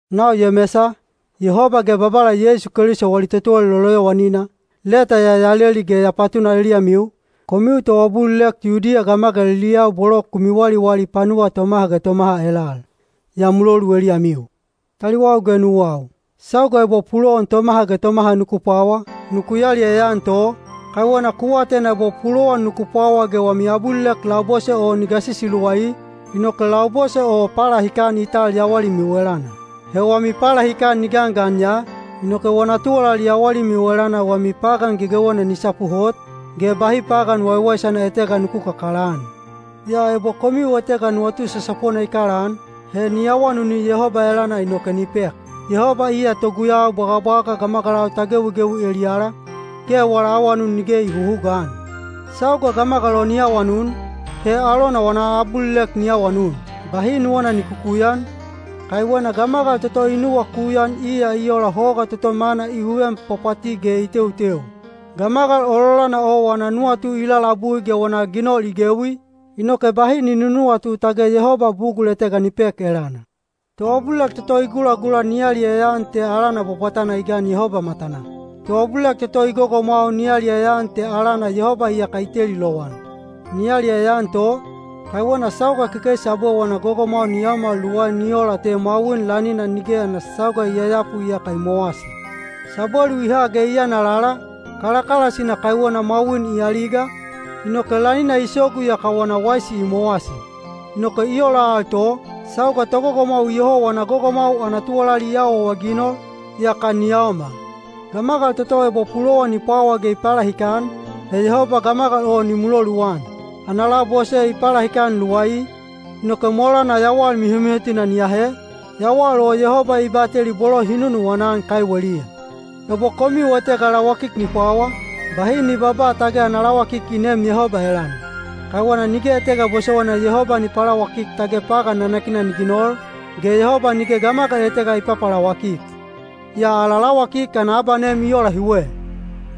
Nau Yemesa, Yehoba ge Babala Yeisu Keliso wali totuwalali loloyowanina, leta ya ya leli ge ya patuna eliyamiu, komiu toabulilek Yudiya gamagaliliyau bolo ku miwaliwali panuwa tomaha ge tomaha elal. Ya mulolu eliyamiu. Taliwau ge nuwau, sauga ebo pulowan tomaha ge tomaha nuku pwawa, nuku yaliyaya-an to, kaiwena ku atena ebo pulowan nuku pwawa ge wami abulilek labose o ni gasisi luwai, inoke labose o palahikan i tal yawalimiu elana. He wami palahikan ni gangan ya, inoke wana tuwalali yawalimiu elana wami pagan gegewena ni sapu hot, ge bahi pagan waiwaisana etega nuku kakalaan. Yaa ebo komiu etega nuwatu sasapona i kalaan, he ni awanuni Yehoba elana inoke ni pek. Yehoba iya toguyau bwagabwaga gamagalau ta gewigewi eliyala, ge wala awanun nige i huhugaan. Sauga gamagal o ni awanun, he alona wana abulilek ni awanun, bahi nuwana ni kukuyan, kaiwena gamagal toto i nuwakuyan iya i ola hoga toto mana i huven pwapwati ge i teuteu. Gamagal ololana o wana nuwatu i lalabui ge wana ginol i gewi, inoke bahi ni nunuwatu tage Yehoba bugul etega ni pek elana. Toabulilek toto i gulagula ni yaliyaya-an te alana bwabwatana i gan Yehoba matanaa. Toabulilek toto i gogomwau ni yaliyaya-an te alana Yehoba iyaka i teli lowan. Ni yaliyaya-an to, kaiwena sauga kekeisi abwe wana gogomwau ni yaomal luwai ni ola te mwawin lanina nige ana sauga i yayapu yaka i mowasi. Sabwelu i ha ge i yana lala, kalakalasina kaiwena mwawin i aliga, inoke lanina i sogu yaka wana waisi i mowasi. Inoke i ola al to, sauga togogomwau iyoho wana gogomwau ana tuwalali i awaawaginol, yaka ni yaomal. Gamagal toto ebo pulowan i pwawa ge i palahikan, he Yehoba gamagal o ni muloluan. Ana labose i palahikan luwai, inoke molana yawal mihomihotina ni ahe, yawal o Yehoba i bateli bolo hi nunuwana-an kaiweliya. Ebo komiu etega lawakik ni pwawa, bahi ni babaa tage ana lawakik i neem Yehoba elana. Kaiwena nige etega bosowaina Yehoba ni palawakik tage pagan nanakina ni ginol, ge Yehoba nige gamagal etega i papalawakik. Yaa ala lawakik ana abanem i ola hiwe: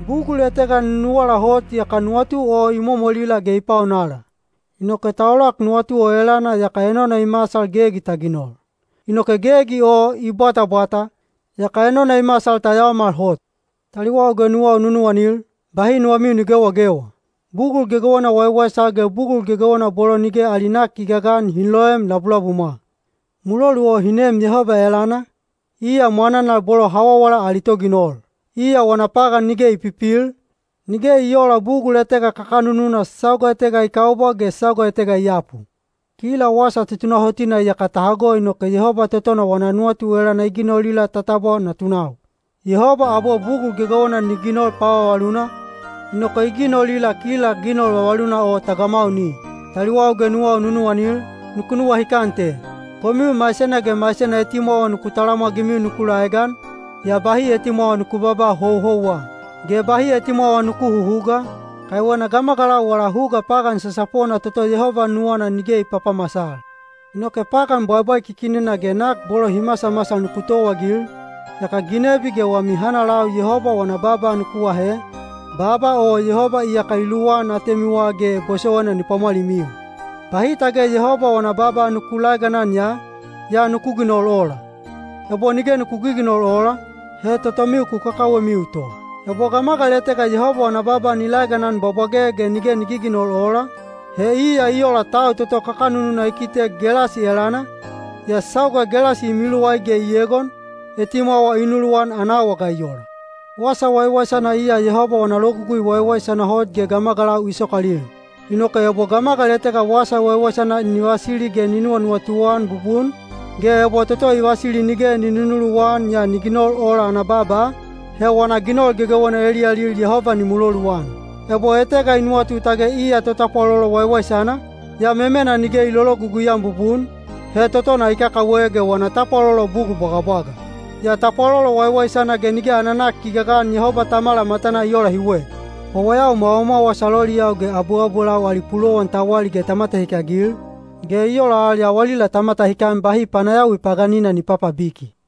bugul etega nunuwala hot yaka nuwatu o i momolila ge i paonala. Inoke ta olak nuwatu o elana yaka enona i masal gegi ta ginol. Inoke gegi o i bwatabwata, yaka enona i masal ta yaomal hot. Taliwau ge nuwau nunuwanil, bahi nuwamiu ni gewagewa. Bugul gegewena waiwaisana ge bugul gegewena bolo nige ali nak i gagan hi loem labulabumwa. Mulolu o hi neem Yehoba elana, iya mwananal bolo hawawala ali Toginol. Iya wana pagan nige i pipil, nige i oola bugul etega kakanununa sauga etega i kaubwa ge sauga etega i yapu. Kila wasa tutunahotina iyaka ta hago inoke Yehoba totona wana nuwatu elana i ginolila ta tabwa natunau. Yehoba abwe bugul gegewena ni ginol pavavaluna, inoke i ginolila kila ginol vavaluna o ta gamauni. Taliwau ge nuwau nunuwanil, nuku nuwahikan te: komiu maisena ge maisena etimwawa nuku talamwagimiu nuku laegan, yaa bahi etimwawa nuku babaa houhouwa. Ge bahi etimwawa nuku huhuga, kaiwena gamagalau wala huga pagan sasapona toto Yehoba nuwana nige i papamasal. Inoke pagan bwaibwaikikinina ge nak bolo hi masamasal nuku towaagil, yaka ginebi ge wami hanalau Yehoba wana baaba nuku ahe, baaba o Yehoba iyaka i luwan atemiwa ge bosowaina ni pwamwalimiu. Bahi tage Yehoba wana baaba nuku laeganan ya, yaa nuku ginol ola. Ebo nige nuku giginol ola, he totomiu ku kakawemiu to. Ebo gamagal etega Yehoba wana baaba ni laeganan bwabwage ge nige ni giginol ola, he iya i ola tau toto kakanununa i kitek gelasi elana, yaa sauga gelasi i miluwai ge i egon, etimwawa i nuluwan ana awa ga i ola. Wasa waiwaisana iya Yehoba wana logugui waiwaisana hot ge gamagalau i sokalil. Inoke ebo gamagal etega wasa waiwaisana ni vasili ge ni nuwanuwatu-an bubun, ge ebo toto i vasili nige ni nunuluwan yaa ni ginol ola ana baaba, he wana ginol gegewena eliyalil Yehoba ni muloluan. Ebo etega i nuwatu tage iya totapwalolo waiwaisana, yaa memena nige i lologugui-an bubun, he totona i kakawe ge wana tapwalolo bugul bwagabwaga. Yaa tapwalolo waiwaisana ge nige ana nak i gagan Yehoba Tamala matanaa i ola hiwe: wawayau mwawamwawas aloliyau ge abuabulau ali pulowan ta wali ge ta matahikagil, ge i ola al yawalila ta matahikan bahi panayawi paganina ni papabiki.